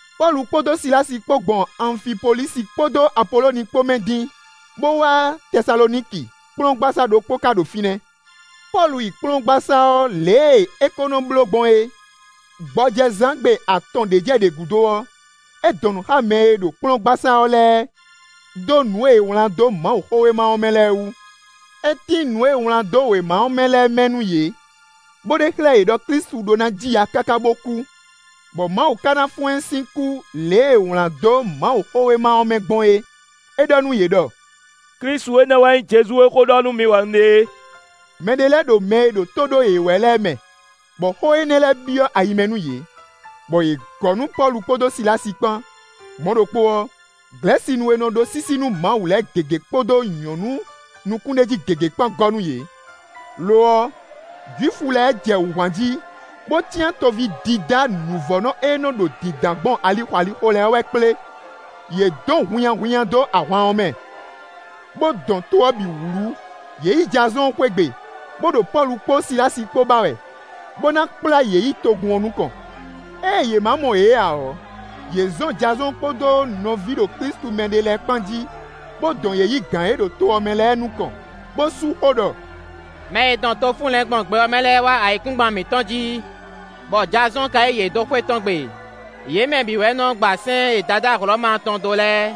Pɔ́lu kpódó Silási kpó gbɔn Anfipolísi kpódó Apoloni kpó mɛ dín, bó wá Tɛsaloniki; kplɔ́ngbasá ɖokpó ka ɖo fínɛ́. Pɔ́lu yi kplɔ́ngbasá ɔ́ lě e é ko nɔ bló gbɔn é. Gbɔjɛzán gbe atɔn ɖě jɛ ɖě gúdo ɔ́, é dɔn nǔ xá mɛ e ɖo kplɔ́ngbasá ɔ́ lɛ́ɛ dó nǔ e è wlǎn dó Mawuxówéma ɔ́ mɛ lɛ́ɛ wú. É tín nǔ e è wlán dó wěma ɔ́ mɛ lɛ́ɛ mɛ nú yě, bó ɖe xlɛ́ yě ɖɔ Klísu ɖó ná ji ya káká bó kú, bɔ Mawu ka ná fɔ́n ɛ sín kú lě e è wlǎn dó Mawuxówéma ɔ́ mɛ gbɔn é; é ɖɔ nú yě ɖɔ: “Klísu énɛ́ wɛ nyí Jezu e xó ɖɔ nú mi wɛ un ɖe é.” Mɛ ɖé lɛ́ɛ ɖo mɛ e ɖo tó ɖó yě wɛ lɛ́ɛ mɛ, bɔ xó énɛ́ lɛ́ɛ byɔ́ ayi mɛ nú yě, bɔ yě gɔ́ nú Pɔ́lu kpódó Silási kpán; mɔ̌ ɖokpó ɔ́, Glɛ̌sinu e nɔ ɖó sísí nú Mawu lɛ́ɛ gěgé kpódó nyɔ̌nu nukúnɖéjí gěgé kpán gɔ́ nú yě. Lo ɔ́, Jwifu lɛ́ɛ jɛ wǔ hwan jí, bó cyán toví dídá nǔvɔ́nɔ e nɔ́ ɖo dǐndán gbɔn alixo alixo wɛ lɛ́ɛ kplé; yě dɔn hunnyahunnya dó ahwan ɔ́ mɛ, bó dɔn to ɔ́ bǐ wlú. Yě yi Jazɔ́ɔn xwé gbe, bó ɖo Pɔ́lu kpó Silási kpó ba wɛ, bó ná kplá yě yi togun ɔ́ nukɔn. Ée yě ma mɔ yě ǎ ɔ́, yě zɔn Jazɔ́ɔn kpódó nɔví ɖo Klísu mɛ ɖé lɛ́ɛ kpán jí, bó dɔn yě yi gǎn e ɖo to ɔ́ mɛ lɛ́ɛ nukɔn, bó sú xó ɖɔ: “Mɛ e dɔn to fúnlɛ̌n gbɔn gbɛ ɔ́ mɛ lɛ́ɛ wá ayǐkúngban mǐtɔn jí, bɔ Jazɔ́ɔn ka yí yě dó xwé tɔn gbe; yě mɛ bǐ wɛ nɔ gba sɛ́n e Dadá Hlɔ̌ma tɔn dó lɛ́ɛ,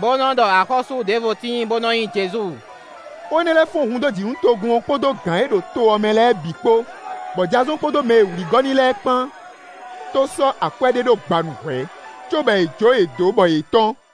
bó nɔ ɖɔ axɔ́sú ɖěvo tíin bó nɔ́ nyí Jezu.” Xó énɛ́ lɛ́ɛ fɔ́n hun dó jǐ nú togun ɔ́ kpódó gǎn e ɖo to ɔ́ mɛ lɛ́ɛ bǐ kpó, bɔ Jazɔ́ɔn kpódó mɛ e è wlǐ gɔ́ n'i lɛ́ɛ kpán tó sɔ́ akwɛ́ ɖé ɖó gbanu hwɛ̌, cóbɔ è jó yě dó bɔ yě tɔ́n.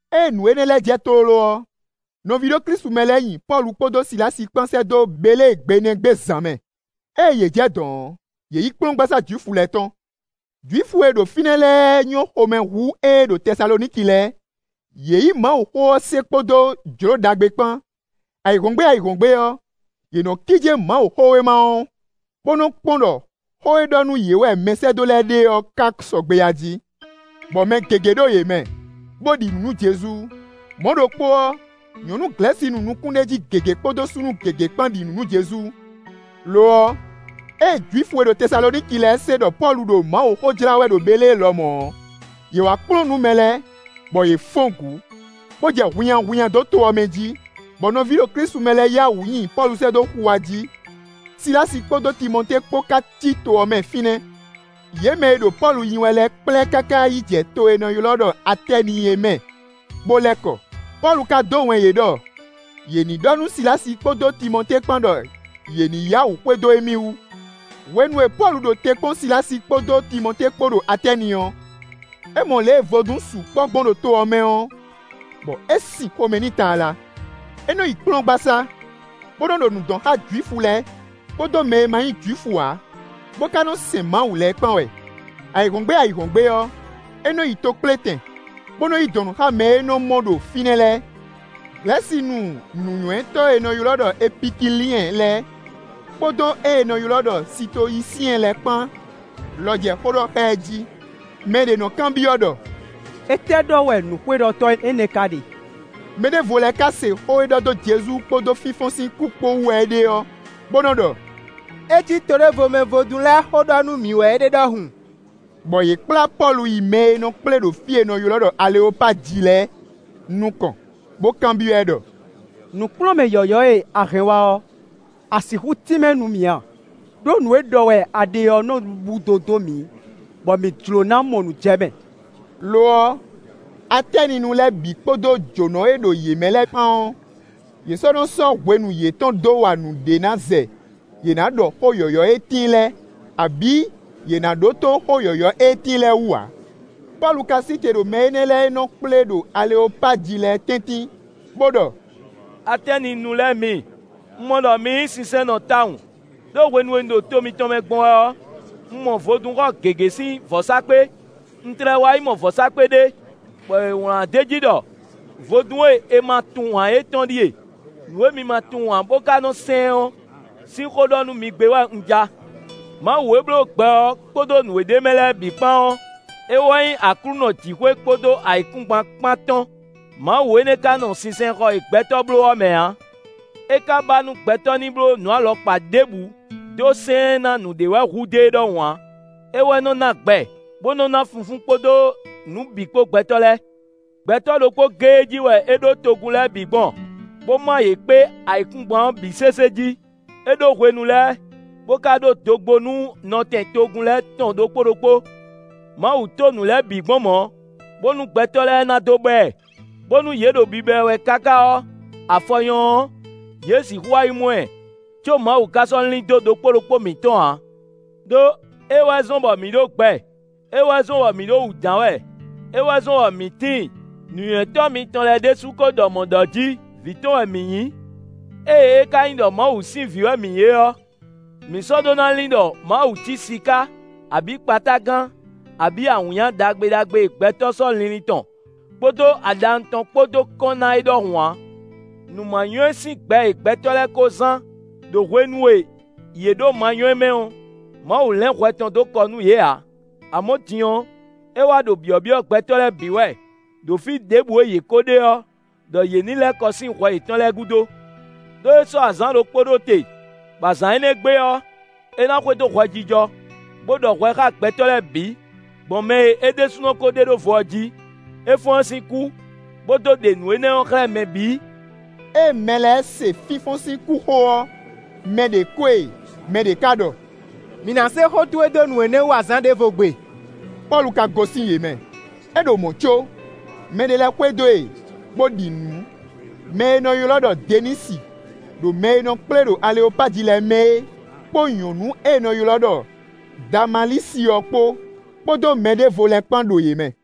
Ée nǔ énɛ́ lɛ́ɛ jɛ tlóló ɔ́, nɔví ɖo Klísu mɛ lɛ́ɛ nyi Pɔ́lu kpódó Silási kpán sɛ́ dó Belée gbe nɛ́ gbe zǎn mɛ. Ée yě jɛ dɔ̌n ɔ́, yě yi kplɔ́ngbasá Jwifu lɛ́ɛ tɔn. Jwifu e ɖo fínɛ́ lɛ́ɛ nyɔ́ xomɛ hú éé ɖo Tɛsaloniki lɛ́ɛ; yě yí Mawuxó se kpódó jlǒ ɖagbe kpán. Ayǐhɔ́ngbe ayǐhɔ́ngbe ɔ́, yě nɔ́ kíjé Mawuxówéma ɔ́, bó nɔ kpɔ́n ɖɔ xó e ɖɔ nú yě wɛ mɛsɛ́dó lɛ́ɛ ɖe ɔ́ ka sɔgbe ají. Bɔ mɛ gěgé ɖo yě mɛ, bó ɖi nǔ nú Jezu; mɔ̌ ɖokpó ɔ́, nyɔ̌nu Glɛ̌sinu nukúnɖéjí gěgé kpódó súnnu gěgé kpán ɖi nǔ nú Jezu. Lo ɔ́, éé Jwifu e ɖo Tɛsaloniki lɛ́ɛ se ɖɔ Pɔ́lu ɖo Mawuxó jlá wɛ ɖo Belée lɔmɔ̌ ɔ́, yě wá kplɔ́n nǔ mɛ lɛ́ɛ, bɔ yě fɔ́n gǔ, bó jɛ hunnyahunnya dó to ɔ́ mɛ jí, bɔ nɔví ɖo Klísu mɛ lɛ́ɛ yá wǔ nyi Pɔ́lu sɛ́ dó xuwa jí; Silási kpódó Timɔtée kpó ká cí to ɔ́ mɛ fínɛ́. Yě mɛ e ɖo Pɔ́lu nyi wɛ lɛ́ɛ kplá ɛ káká yi jɛ to e è nɔ ylɔ́ ɖɔ Atɛ́ni é mɛ bó lɛ́ kɔ. Pɔ́lu ka dó wɛn yě ɖɔ yě ní ɖɔ nú Silási kpódó Timɔtée kpán ɖɔ yě ní yá wǔ xwedó émí wú. Hwenu e Pɔ́lu ɖo te kpɔ́n Silási kpódó Timɔtée kpó ɖo Atɛ́ni ɔ́, é mɔ lě e vodún sukpɔ́ gbɔn ɖo to ɔ́ mɛ ɔ́, bɔ é sin xomɛ n'i tlala. É nɔ yi kplɔ́ngbasá, bó nɔ́ ɖo nǔ dɔn xá Jwifu lɛ́ɛ kpódó mɛ e ma nyí Jwifu ǎ, bó ka nɔ́ sɛn Mawu lɛ́ɛ kpán wɛ. Ayǐhɔ́ngbe ayǐhɔ́ngbe ɔ́, é nɔ́ yi tokplétɛn, bó nɔ́ yi dɔn nǔ xá mɛ e é nɔ mɔ ɖo fínɛ́ lɛ́ɛ. Glɛ̌sinu nǔnywɛ́tɔ́ e è nɔ ylɔ́ Epikiliɛn lɛ́ɛ kpódó ée è nɔ ylɔ́ ɖɔ Sitoyisiɛn lɛ́ɛ kpán lɔ jɛ xó ɖɔ xá ɛ jí. Mɛ ɖě nɔ́ kanbyɔ́ ɖɔ: “Étɛ́ ɖɔ wɛ nǔxweɖɔtɔ́ énɛ́ ka ɖe?” Mɛ ɖěvo lɛ́ɛ ká se xó e ɖɔ dó Jezu kpódó fínfɔ́n sín kú kpó wú wɛ é ɖe ɔ́, bó nɔ́ ɖɔ: “É cí to ɖěvo mɛ vodún lɛ́ɛ xó ɖɔ nú mǐ wɛ é ɖe ɖɔhun.” Bɔ yě kplá Pɔ́lu yi mɛ e nɔ́ kplé ɖo fí e è nɔ ylɔ́ ɖɔ Aleopaji lɛ́ɛ nukɔn, bó kanbyɔ́ ɛ ɖɔ: “Nǔkplɔ́nmɛ yɔ̌yɔ́ e a hɛn wá ɔ́, a sixú tínmɛ nú mǐ a? Đó nǔ e ɖɔ wɛ a ɖe ɔ́ nɔ́ búdo dó mǐ, bɔ mǐ jló ná mɔ nǔ jɛ mɛ.” (Lo ɔ́, Atɛ́ninu lɛ́ɛ bǐ kpódó jǒnɔ e ɖo yě mɛ lɛ́ɛ kpán ɔ́, yě sɔ́ nɔ́ sɔ́ hwenu yětɔn dó wa nǔɖé ná zɛ yě ná ɖɔ xó yɔ̌yɔ́ e tíin lɛ́ɛ, abǐ yě ná ɖótó xó yɔ̌yɔ́ e tíin lɛ́ɛ wú ǎ.) Pɔ́lu ka sí te ɖo mɛ énɛ́ lɛ́ɛ e nɔ kplé ɖo Aleopaji lɛ́ɛ tɛ́ntin, bó ɖɔ: “Atɛ́ninu lɛ́ɛ mi; un mɔ ɖɔ mi nyí sinsɛnnɔ tawun. Đó hwenu e un ɖo to mitɔn mɛ gbɔn wɛ ɔ́, un mɔ vodúnxɔ gěgé sín vɔ̌sákpe; un tlɛ wá yi mɔ vɔ̌sákpe ɖé, bɔ è wlǎn d'é jí ɖɔ: ‘Vodún e è ma tunwun ǎ é tɔn ɖíe.’ Nǔ e mi ma tunwun ǎ bó ka nɔ́ sɛn ɔ́ sín xó ɖɔ nú mi gbé wɛ un ja. Mawu e bló gbɛ ɔ́ kpódó nǔ e ɖ'é mɛ lɛ́ɛ bǐ kpán ɔ́, é wɛ nyí Aklúnɔ jǐxwé kpódó ayǐkúngban kpán tɔn. Mawu énɛ́ ka nɔ́ nɔ sinsɛnxɔ e gbɛtɔ́ bló ɔ́ mɛ ǎ. É ka ba nú gbɛtɔ́ ní bló nǔ alɔkpa ɖěbǔ dó sɛn ɛ ná nǔɖé wɛ hudó e ɖɔhun ǎ; é wɛ nɔ́ ná gbɛ, bó nɔ́ ná funfún kpódó nǔ bǐ kpó gbɛtɔ́ lɛ́ɛ. Gbɛtɔ́ ɖokpó géé jí wɛ é ɖó togun lɛ́ɛ bǐ gbɔn, bó ma yě kpé ayǐkúngban ɔ́ bǐ sésé jí; é ɖó hwenu lɛ́ɛ, bó ka ɖó dogbó nú nɔtɛn togun lɛ́ɛ tɔn ɖokpó ɖokpó. Mawu to nǔ lɛ́ɛ bǐ gbɔn mɔ̌, bónú gbɛtɔ́ lɛ́ɛ ná dó ba ɛ, bónú yě ɖo biba ɛ wɛ káká ɔ́, afɔ nyɔ́ ɔ́, yě sixú wá yi mɔ ɛ; có Mawu ka sɔ́ lín dó ɖokpó ɖokpó mǐtɔn ǎ. “Đó, é wɛ zɔ́n bɔ mǐ ɖo gbɛ; é wɛ zɔ́n bɔ mǐ ɖo wǔ dǎn wɛ; é wɛ zɔ́n bɔ mǐ tíin. Nǔnywɛ́tɔ́ mitɔn lɛ́ɛ ɖésú ko ɖɔ mɔ̌ ɖɔ jí: “Vǐ tɔn wɛ mǐ nyí.” “Ée é ka nyí ɖɔ Mawu sín vǐ wɛ mǐ nyí é ɔ́, mǐ sɔ́ ɖó ná lin ɖɔ Mawu cí siká abǐ kpatágan abǐ awǐnnya ɖagbe ɖagbe e gbɛtɔ́ sɔ́ linlin tɔn kpódó aɖawun tɔn kpó dó kɔn ná é ɖɔhun ǎ. Nǔ ma nywɛ́ sín gbɛ e gbɛtɔ́ lɛ́ɛ kó zán ɖo hwenu e yě ɖo manywɛ́ mɛ ɔ́, Mawu lɛ́n hwɛ tɔn dó kɔ nú yě ǎ; amɔ̌ din ɔ́, é wá ɖo byɔ̌byɔ́ gbɛtɔ́ lɛ́ɛ bǐ wɛ, ɖo fí ɖěbǔ e yě kó ɖe ɔ́, ɖɔ yě ní lɛ́ kɔ sín hwɛ yětɔn lɛ́ɛ gúdo. Đó é sɔ́ azǎn ɖokpó ɖó te, bɔ azǎn énɛ́ gbe ɔ́, é ná xwedó hwɛjijɔ, bó ɖɔ hwɛ xá gbɛtɔ́ lɛ́ɛ bǐ, gbɔn mɛ e é ɖésúnɔ ko ɖe ɖó vo ɔ́ jí. É fɔ́n ɛ sín kú, bó dó ɖe nǔ énɛ́ ɔ́ xlɛ́ mɛ bǐ.” Ée mɛ lɛ́ɛ se fínfɔ́n sín kú xó ɔ́, mɛ ɖě ko e; mɛ ɖě ka ɖɔ: “Mǐ ná se xó towe dó nǔ énɛ́ wú azǎn ɖěvo gbe.” Pɔ́lu ka gosín yě mɛ. É ɖo mɔ̌ có, mɛɖé lɛ́ɛ xwedó e, bó ɖi nǔ: mɛ e è nɔ ylɔ́ ɖɔ Denisi ɖo mɛ e nɔ kplé ɖo Aleopaji lɛ́ɛ mɛ é, kpó nyɔ̌nu e è nɔ ylɔ́ ɖɔ Damalísi ɔ́ kpó, kpódó mɛ ɖěvo lɛ́ɛ kpán ɖo yě mɛ.